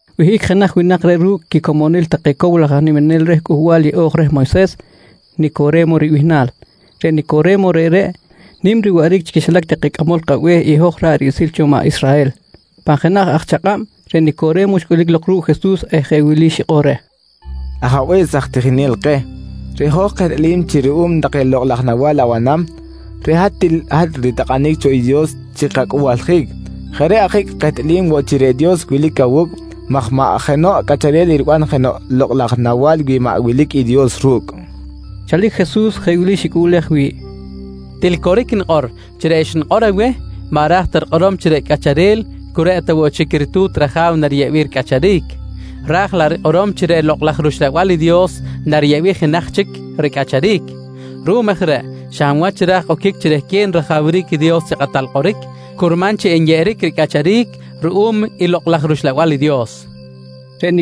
Wihꞌic jenaj winak jeꞌ ru̱cꞌ quicomonil take cow laj aj niminel reh Cꞌuhbal Yeꞌo̱j reh Moyses, Nicore̱mo ribihnal. Reꞌ Nicore̱mo reꞌreꞌ nim riwaꞌric chi quixilac take cꞌamol kabe̱h i hoj ra̱ꞌ riꞌsil cho maꞌ Israhel. Pan jenaj aj chakꞌab reꞌ Nicore̱mo xcꞌulic lok ru̱cꞌ Jesus eh jeꞌ wili xikꞌor reh: «Ajabe̱s aj tijinel keh, reꞌ hoj kehtꞌalim chi ruꞌum take lokꞌ laj nawa̱l abanam, reꞌ hat til hat ritakꞌanic cho i Dios chi kacꞌuhbaljic. Jeꞌ reꞌ ajic kehtꞌalim woꞌ chi reꞌ Dios wilic awu̱cꞌ maj maꞌ jenoꞌ cꞌacharel eriban jenoꞌ lokꞌ laj nawa̱l wi maꞌ wilic i Dios ru̱cꞌ, nqui reh. Chalic Jesus jeꞌ wili xicꞌuꞌlej wi̱ꞌ: «Til coric nikꞌor chi reꞌ xnikꞌor aweh maꞌ ra̱j ta rikꞌorom chi reꞌ cꞌacharel cu reꞌ ta woꞌ chic i ritu̱t raja̱w nariyeꞌbic ricꞌacharic, ra̱j laꞌ rikꞌorom chi reꞌ Lokꞌ laj rUxlabal i Dios nariyeꞌbic jenaj chic ricꞌacharic. Ruꞌum aj reꞌ xa hab wach ra̱j oquic chi rehquen rajawric i Dios chi kꞌatal kꞌoric, curman chi enyeꞌeric ricꞌacharic ruꞌum i Lokꞌ laj rUxlabal i Dios, nqui reh.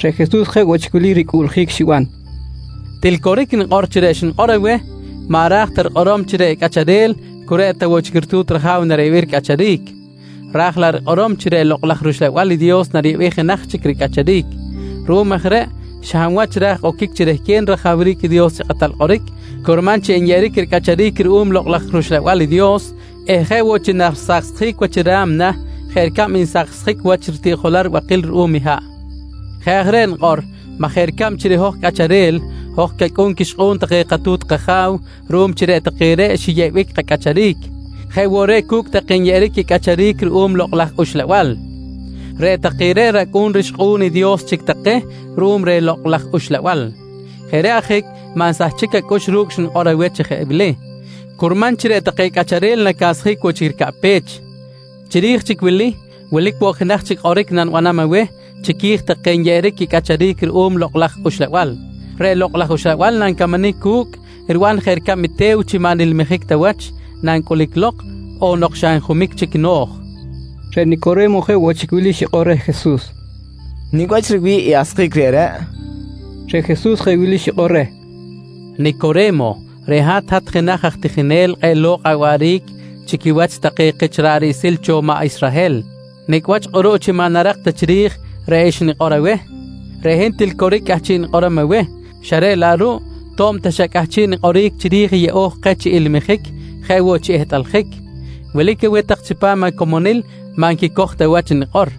Reꞌ Jesus jeꞌ woꞌ chic wili ricꞌuꞌljic xiban: «Til coric nikꞌor chi reꞌ xnikꞌor aweh maꞌ ra̱j ta rikꞌorom chi reꞌ cꞌacharel cu reꞌ ta woꞌ chic i ritu̱t raja̱w nariyeꞌbic ricꞌacharic, ra̱j laꞌ rikꞌorom chi reꞌ Lokꞌ laj rUxlabal i Dios nariyeꞌbic jenaj chic ricꞌacharic. Ruꞌum aj reꞌ xa hab wach ra̱j oquic chi rehquen rajawric i Dios chi kꞌatal kꞌoric, curman chi enyeꞌeric ricꞌacharic ruꞌum i Lokꞌ laj rUxlabal i Dios eh jeꞌ woꞌ chi narisaksjic wach i ra̱mna jeꞌ ricab nsaksjic wach ritiꞌjolal ribakil ruꞌum i haꞌ. Jeꞌ aj reꞌ nikꞌor maj jeꞌ ricab chi reꞌ hoj cꞌacharel, hoj cacꞌu̱n quixkꞌu̱n take katu̱t kaja̱w ruꞌum chi reꞌ take reꞌ xiyeꞌbic kacꞌacharic, jeꞌ woꞌ reꞌ cu̱cꞌ take nyeꞌeric quicꞌacharic ruꞌum i Lokꞌ laj Uxlabal, reꞌ take reꞌ racꞌu̱n rixkꞌu̱n i Dios chic take ruꞌum reh Lokꞌ laj Uxlabal. Jeꞌ reꞌ ajic maꞌ nsahchic acꞌux ru̱cꞌ xnikꞌor aweh chi jeꞌ wili: Curman chi reꞌ take cꞌacharel nacasjic woꞌ chic ricaꞌpech. «Chiri̱j chic i wili, wilic woꞌ jenaj chic kꞌoric nanibanam aweh chiqui̱j take nyeꞌeric quicꞌacharic ruꞌum i Lokꞌ laj Uxlabal: Reꞌ Lokꞌ laj Uxlabal nancamanic cu̱cꞌ riban jeꞌ ricab i te̱w chi maꞌ nilmijic ta wach nancꞌulic lok on nok xa njumic chic no̱j, nqui Jesus. Reꞌ Nicore̱mo jeꞌ woꞌ chic wili xikꞌor reh Jesus: «Nicꞌ wach riwi̱ꞌ i asjic reꞌreꞌ? nqui reh. Reꞌ Jesus jeꞌ wili xikꞌor reh: «Nicore̱mo reꞌ hat, hat jenaj aj tijinel kꞌe̱ꞌ lo̱kꞌ awaꞌric chi quiwach take kich ra̱ꞌ riꞌsil cho maꞌ Israhel, nicꞌ wach kꞌuruꞌ chi maꞌ narak ta chiri̱j reꞌ xnikꞌor aweh? Reꞌ hin til coric i cꞌahchiꞌ nikꞌorom aweh xa reꞌ laꞌ ruꞌ to̱b ta xa cꞌahchiꞌ nikꞌoric chiri̱j i yeꞌo̱j keh chi ilmijic jeꞌ woꞌ chi ehtꞌaljic, wilic aweh tak chipam acomonil, maꞌ nquicoj ta wach i nikꞌor.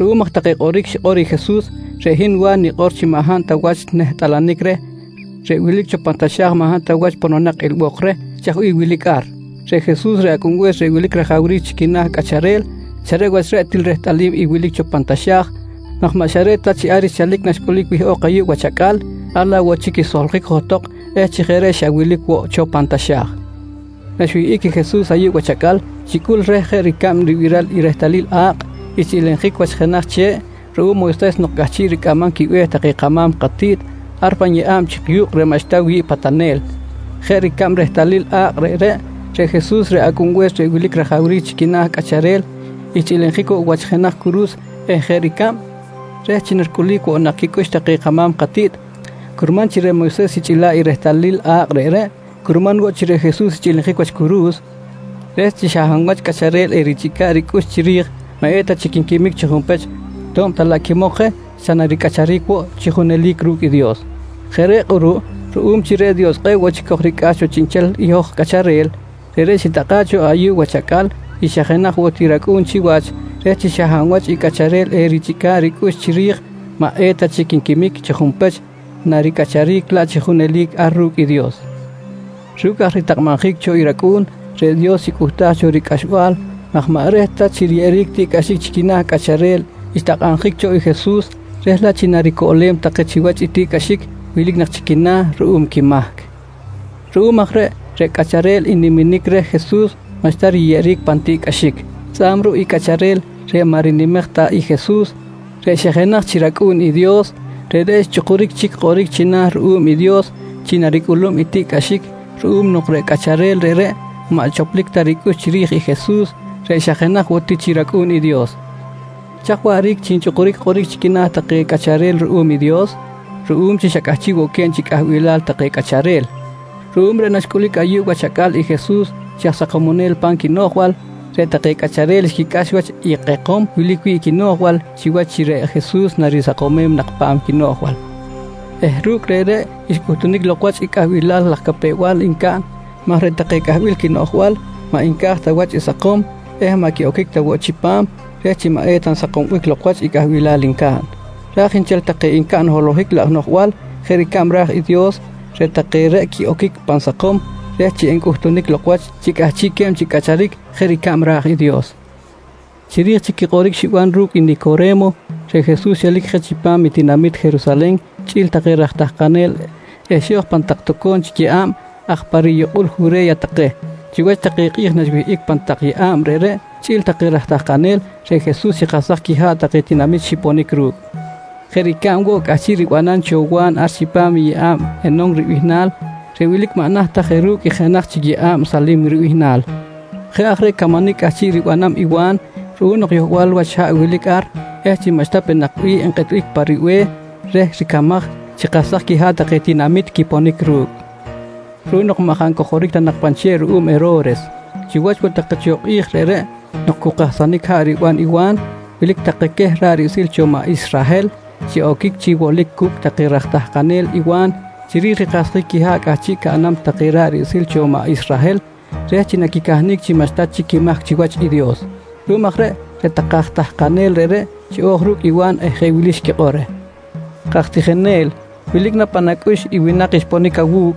Ruꞌum aj take kꞌoric xikꞌor i Jesus, reꞌ hin Wa̱n nikꞌor chi maꞌ hab ta wach nehtꞌalanic reh reꞌ wilic cho pan taxa̱j maj maꞌ hab ta wach pononak cho ilbok reh chaj bih wilic ar. Reꞌ Jesus, reꞌ Acꞌunbe̱s reꞌ wilic rajawric chi quina̱ cꞌacharel, xa reꞌ wach reꞌ til rehtꞌalim i wilic cho pan taxa̱j maj maꞌ xa reꞌ ta chi ar xchalic naxcꞌulic wihꞌok ayuꞌ wach acꞌal, ar laꞌ woꞌ chic xsoljic johtok eh chi jeꞌ reꞌ xa wilic woꞌ cho pan taxa̱j. Naxwihꞌic i Jesus ayuꞌ wach acꞌal xicꞌul reh jeꞌ ricab ribiral i rehtalil a̱kꞌ xchꞌilinjic wach jenaj che̱ꞌ ruꞌum Moyses nok cꞌahchiꞌ ricꞌamam quibe̱h take kama̱m katiꞌt ar pan yeꞌa̱b chik yu̱kꞌ reꞌ maꞌxta wi̱ꞌ patanel. Jeꞌ ricab rehtalil a̱kꞌ reꞌreꞌ, reꞌ Jesus reꞌ Acꞌunbe̱s reꞌ wilic rajawric chi quina̱ cꞌacharel xchꞌilinjic woꞌ wach jenaj curu̱s eh jeꞌ ricab reh chi naricꞌulic woꞌ nak chic quicꞌux take kama̱m katiꞌt curman chi reꞌ Moyses xichꞌila̱ꞌ i rehtalil a̱kꞌ reꞌreꞌ, curman woꞌ chi reꞌ Jesus xchꞌilinjic wach curu̱s reh chi xa hab wach cꞌacharel erichꞌica̱ꞌ ricꞌux chiri̱j maꞌ eta chic nquimic chi junpech to̱b ta laꞌ quimok je xa naricꞌacharic woꞌ chi junelic ru̱cꞌ i Dios. Jeꞌ reꞌ kꞌuruꞌ ruꞌum chi reꞌ Dios kꞌe̱ꞌ woꞌ chic kojricꞌax cho chiꞌnchel i hoj cꞌacharel, reꞌreꞌ xitakꞌa̱ꞌ cho ayuꞌ wach acꞌal i xa jenaj woꞌ ti chi rAcꞌu̱n chiwach, reh chi xa hab wach i cꞌacharel erichꞌica̱ꞌ ricꞌux chiri̱j maꞌ eta chic nquimic chi junpech naricꞌacharic laꞌ chi junelic ar ru̱cꞌ i Dios. Ru̱cꞌ aj ritakꞌabjic cho i racꞌu̱n, reꞌ Dios xicꞌuhtaj cho ricꞌaxbal maj maꞌ reh ta chi riyeꞌeric tiꞌcꞌaxic chi quina̱ cꞌacharel xtakꞌabjic cho i Jesus reh laꞌ chi naricoꞌlem take chiwach i tiꞌcꞌaxic wilic nak chi quina̱ ruꞌum quimahc. Ruꞌum aj reꞌ, reꞌ cꞌacharel n-niminic reh Jesus maꞌxta riyeꞌeric pan tiꞌcꞌaxic. Tzꞌa̱b ruꞌ i cꞌacharel reꞌ maꞌ rinimej ta i Jesus reꞌ xa jenaj chi rAcꞌu̱n i Dios, reꞌreꞌ xchꞌukuric chic kꞌoric china̱ ruꞌum i Dios chi naricꞌulum i tiꞌcꞌaxic ruꞌum nok reꞌ cꞌacharel reꞌreꞌ maꞌ choplic ta ricꞌux chiri̱j i Jesus reꞌ xa jenaj woꞌ ti chi rAcꞌu̱n i Dios. Chaj waꞌric chi nchꞌukuric kꞌoric chi quina̱ take cꞌacharel ruꞌum i Dios? Ruꞌum chi xa cꞌahchiꞌ woꞌ que̱b chi cꞌahbilal take cꞌacharel. Ruꞌum reꞌ naxcꞌulic ayuꞌ wach acꞌal i Jesus chi aj sakomonel pa̱m quinoꞌjbal, reꞌ take cꞌacharel xquicꞌax wach i kꞌekom wilic wi̱ꞌ i quinoꞌjbal chiwach chi reꞌ Jesus narisakomem nak pa̱m quinoꞌjbal eh ru̱cꞌ reꞌreꞌ xcꞌuhtunic lok wach i cꞌahbilal laj capew-bal ncaꞌn maj reꞌ take cꞌahbil quinoꞌjbal maꞌ nca̱j ta wach i sakom eh maꞌ quiꞌoquic ta woꞌ chipam reh chi maꞌ eta nsakombic lok wach i cꞌahbilal ncaꞌn, raj nchel take ncaꞌn holohic laj noꞌjbal jeꞌ ricab ra̱j i Dios, reꞌ take reꞌ quiꞌoquic pan sakom reh chi encꞌutunic lok wach chi cꞌahchiꞌque̱b chi cꞌacharic jeꞌ ricab ra̱j i Dios. Chiri̱j chic i kꞌoric xiban ru̱cꞌ i Nicore̱mo, reꞌ Jesus xelic je chipam i tinamit Jerusalen chꞌi̱l take raj tahkanel eh xo̱j pan tak toco̱m chic yeꞌa̱b aj pa riyukꞌul Jure̱ya take. Chiwach take kꞌi̱j naxwihꞌic pan tak yeꞌa̱b reꞌreꞌ chꞌi̱l take raj tahkanel, reꞌ Jesus xikahsaj quiha̱ꞌ take tinamit xiponic ru̱cꞌ jeꞌ ricab woꞌ cꞌahchiꞌ ribanam cho Wa̱n ar chipam i yeꞌa̱b Enon ribihnal reꞌ wilic maꞌ naht ta je ru̱cꞌ i jenaj chic yeꞌa̱b Salim ribihnal. Jeꞌ aj reꞌ camanic cꞌahchiꞌ ribanam i Wa̱n ruꞌum nok yohbal wach haꞌ wilic ar eh chi maꞌxta peꞌ nak bih nkꞌetbic pa ribe̱h reh ricamaj xikahsaj quiha̱ꞌ take tinamit quiponic ru̱cꞌ, ruꞌum nok maꞌ jaꞌ ncojoric ta nak pan che̱ꞌ ruꞌum Hero̱res. Chiwach woꞌ take cho kꞌi̱j reꞌreꞌ nok cu kahsanic haꞌ riban i Wa̱n wilic take queh ra̱ꞌ riꞌsil cho maꞌ Israhel xiꞌoquic chi wolic cu̱cꞌ take raj tahkanel i Wa̱n chiri̱j rikahsjic quiha̱ꞌ cꞌahchiꞌ caꞌnam take ra̱ꞌ riꞌsil cho maꞌ Israhel reh chi naquicahnic chi maꞌxta chic quimahc chiwach i Dios. Ruꞌum aj reꞌ, reꞌ take aj tahkanel reꞌreꞌ xiꞌo̱j ru̱cꞌ i Wa̱n eh jeꞌ wili xquikꞌor reh: «Kaj tijinel, wilic na pan acꞌux i winak xponic awu̱cꞌ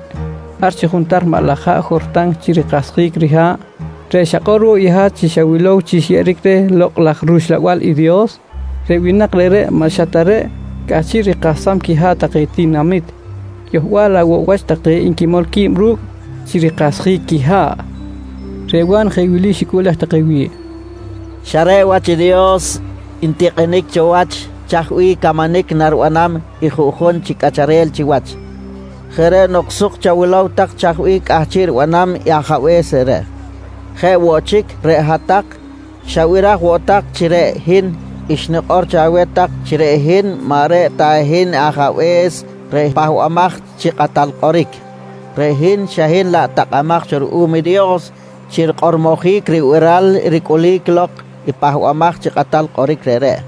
ar chi juntar maꞌ laj haꞌ Jortan chi rikahsjic riha̱ꞌ, reꞌ xakꞌor woꞌ i hat chi xawilow chi xyeꞌeric reh Lokꞌ laj rUxlabal i Dios? Reꞌ winak reꞌreꞌ maꞌ xa ta reꞌ cꞌahchiꞌ rikahsam quiha̱ꞌ take tinamit, yohbal laꞌ woꞌ wach take nquimol qui̱b ru̱cꞌ chi rikahsjic quiha̱ꞌ, nqui take reh. Reꞌ Wa̱n jeꞌ wili xicꞌuꞌlej take wi̱ꞌ: «Xa reꞌ wach Dios ntikꞌinic cho wach chaj bih camanic naribanam i juꞌjun chi cꞌacharel chiwach. Jeꞌ reꞌ nok suk chawilow tak i chaj bih cꞌahchiꞌ ribanam i Ajabe̱s reꞌreꞌ. Jeꞌ woꞌ chic reꞌ hat-tak xabiraj woꞌ tak chi reꞌ hin xnikꞌor cho aweh tak chi reꞌ hin maꞌ reꞌ ta hin i Ajabe̱s reꞌ Pahbamaj chi Kꞌatal Kꞌoric. Reꞌ hin xa hin laꞌ takꞌamaj cho ruꞌum i Dios chi rikꞌormojic ribiral ricꞌulic lok i Pahbamaj chi Kꞌatal Kꞌoric reꞌreꞌ.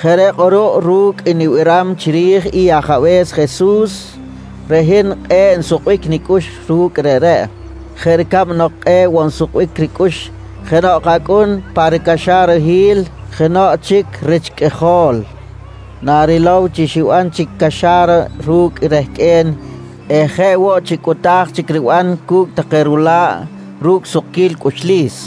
Jeꞌ reꞌ kꞌuruꞌ ru̱cꞌ i nibiram chiri̱j i Ajabe̱s Jesus, reꞌ hin kꞌe̱ꞌ nsukbic nicꞌux ru̱cꞌ reꞌreꞌ jeꞌ ricab nok kꞌe̱ꞌ woꞌ nsukbic ricꞌux jenoꞌ acꞌun pa ricaxarahil jenoꞌ chic rich qꞌuijol narilow chi xiban chic caxa̱ra ru̱cꞌ rehqꞌue̱n eh jeꞌ woꞌ chi cꞌuta̱j chic riban cu̱cꞌ take rula̱ꞌ ru̱cꞌ sukquil cꞌuxlis.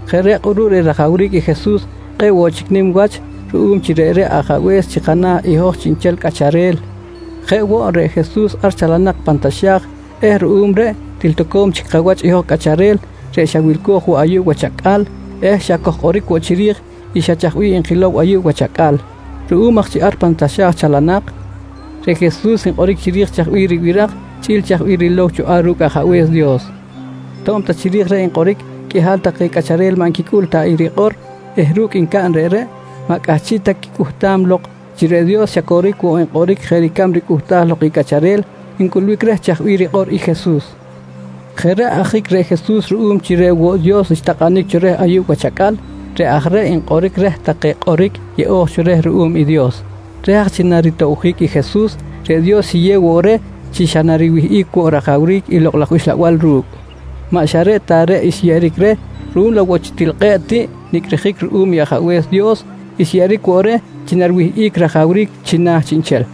Jeꞌ reꞌ kꞌuruꞌ reꞌ rajawric i Jesus kꞌe̱ꞌ woꞌ chic nim wach ruꞌum chi reꞌreꞌ Ajabe̱s chi kana̱ i hoj chiꞌnchel cꞌacharel. Jeꞌ woꞌ, reꞌ Jesus ar chalanak pan taxa̱j eh ruꞌum reꞌ til toco̱m chi kawach i hoj cꞌacharel reꞌ xa wilco̱j woꞌ ayuꞌ wach acꞌal eh xa kojkꞌoric woꞌ chiri̱j i xa chaj bih nkilow ayuꞌ wach acꞌal. Ruꞌum aj chi ar pan taxa̱j chalanak, reꞌ Jesus nkꞌoric chiri̱j chaj bih ribiraj chꞌi̱l chaj bih rilow cho ar ru̱cꞌ Ajabe̱s Dios. To̱b ta chiri̱j reꞌ nkꞌoric, qꞌuihal take cꞌacharel maꞌ nquicꞌul ta i rikꞌor eh ru̱cꞌ ncaꞌn reꞌreꞌ, maꞌ cꞌahchiꞌ ta quicꞌuhtam lok chi reꞌ Dios xa coric woꞌ nkꞌoric jeꞌ ricab ricꞌuhtaj lok i cꞌacharel ncꞌulbic reh chaj bih rikꞌor i Jesus. Jeꞌ reꞌ ajic reꞌ Jesus ruꞌum chi reꞌ woꞌ Dios xtakꞌanic cho reh ayuꞌ wach acꞌal, reꞌ aj reꞌ nkꞌoric reh take kꞌoric yeꞌo̱j cho reh ruꞌum i Dios. Reh aj chi naritoꞌbjic i Jesus, reꞌ Dios xiyew woꞌ reh chi xa nariwihꞌic woꞌ rajawric i Lokꞌ laj Uxlabal ru̱cꞌ. Maꞌ xa reꞌ ta reꞌ xyeꞌeric reh, ruꞌum laꞌ woꞌ chi til kꞌe̱ꞌ tiꞌ nicꞌrijic ruꞌum i Ajabe̱s Dios, xyeꞌeric woꞌ reh chi nariwihꞌic rajawric china̱ chiꞌnchel.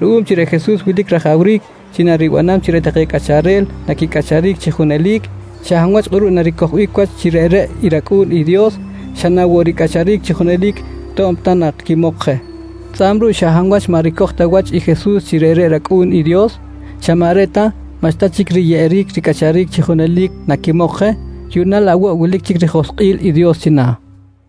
Ruꞌum chi reꞌ Jesus wilic rajawric chi naribanam chi reꞌ take cꞌacharel naquicꞌacharic chi junelic, xa hab wach kꞌuruꞌ naricojbic wach chi reꞌreꞌ i rAcꞌu̱n i Dios xa na woꞌ ricꞌacharic chi junelic to̱b ta nak quimok je. Tzꞌa̱b ruꞌ xa hab wach maꞌ ricoj ta wach i Jesus chi reꞌreꞌ rAcꞌu̱n i Dios, xa maꞌ reꞌ ta maꞌxta chic riyeꞌeric ricꞌacharic chi junelic naquimok je, yuꞌna laꞌ woꞌ wilic chic rijoskꞌil i Dios china̱.